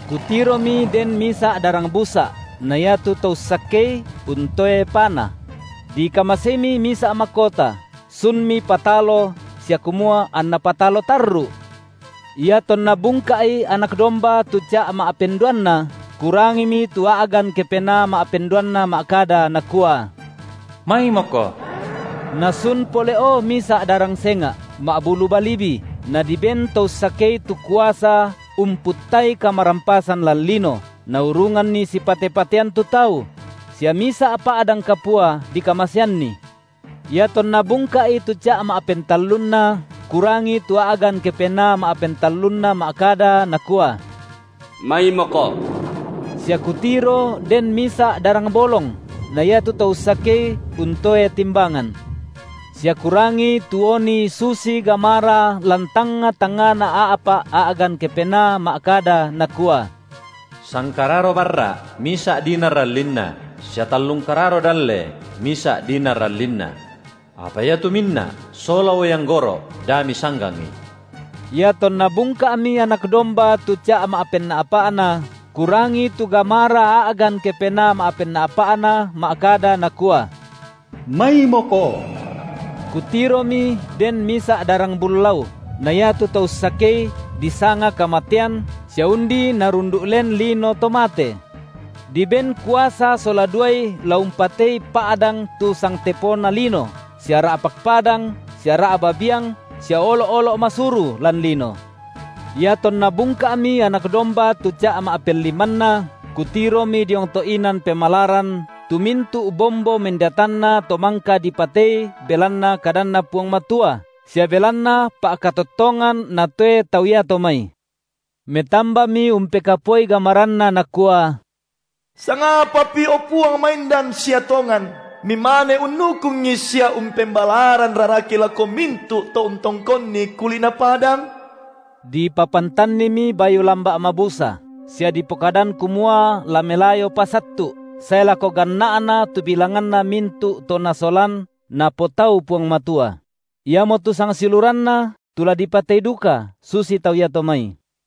Kutiromi den misa’ darang busa’, na iatu to ussakei untoe pana; dikamaseimi misa’ makota, sunmi patalo sia kumua anna patalo tarru’. Iatonna bungka’i Anak domba tu ca’ ma’penduanna, kurangimi tu a’gan kepenaa ma’penduanna ma’kada, nakua: Maimoko. Nasun pole’o misa’ darang senga’, ma’bulu balibi, nadiben to ussakei tu kuasa umputtai kamarampasan lan lino, naurunganni sipate-patean tu tau; sia misa’ pa’dang kapua dikamaseanni. Iatonna bungka’i tu ca’ ma’pentallunna, kurangi tu a’gan kepenaa ma’pentallunna ma’kada, nakua: Maimoko. Sia kutiro den misa’ darang bolong, na iatu to ussakei untoe timbangan. Sia kurangi tu oni susi gamara lan tangnga-tangngana a’pa’ a’gan kepenaa ma’kada, nakua: Sangkararo barra’ misa’ dinar allinna, sia tallung kararo dalle misa’ dinar allinna. Apa iatu minna’ sola uai anggoro’ da misanggangi. Iatonna bungka’mi Anak domba tu ca’ ma’penna’pa’na, kurangi tu gamara a’gan kepenaa ma’penna’pa’na ma’kada, nakua: Maimoko. Kutiromi den misa’ darang bullau, na iatu to ussakei disanga kamatean sia undi narundu’ len lino to mate. Diben kuasa sola duai la umpatei pa’dang tu sangtepona lino sia ra’pak padang sia ra’ba biang sia olo’-olo’ masuru lan lino. Iatonna bungka’mi Anak domba tu ca’ ma’pellimanna, kutiromi diong to’ inan pemalaran tu mintu’ bombo mendeatanna to mangka dipatei belanna kadanNa Puang Matua sia belanna pa’katottongan natoe tau iato mai. Metambami umpekapuai gamaranna nakua: Sangapapi, o Puang maindan sia tongan, Mimane unnukungi sia umpembalaran raraki lako mintu’ to untongkonni kuli’na padang? Dipapantannimi bayu lamba’ mabusa, sia dipokadan kumua la melayopa sattu’, sae lako ganna’na tu bilanganna mintu’ to nasolan Napotau Puang Matua; iamotu sangsiuluranna tu la dipatei duka susi tau iato mai.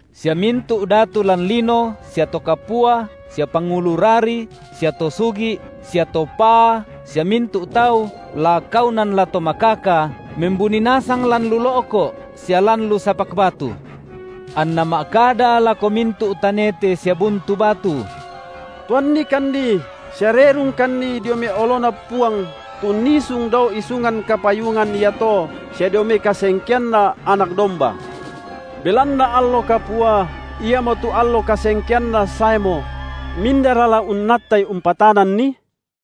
Sia mintu’ datu lan lino sia to kapua sia pangulu rari sia to sugi’ sia to paa sia mintu’ tau, la kaunan la to makaka, membuni nasang lan lu lo’ko’ sia lan lu sapak batu. Anna ma’kada lako mintu’ tanete sia buntu batu: Tuannikanni sia rerungkanni dio mai oloNa Puang tu unnisung dao isungan kapayungan iato, sia dio mai kasengkeanNa Anak domba. Belanna allo kapua, iamotu allo kasengkeanNa saemo; mindara la unnattai umpatananni?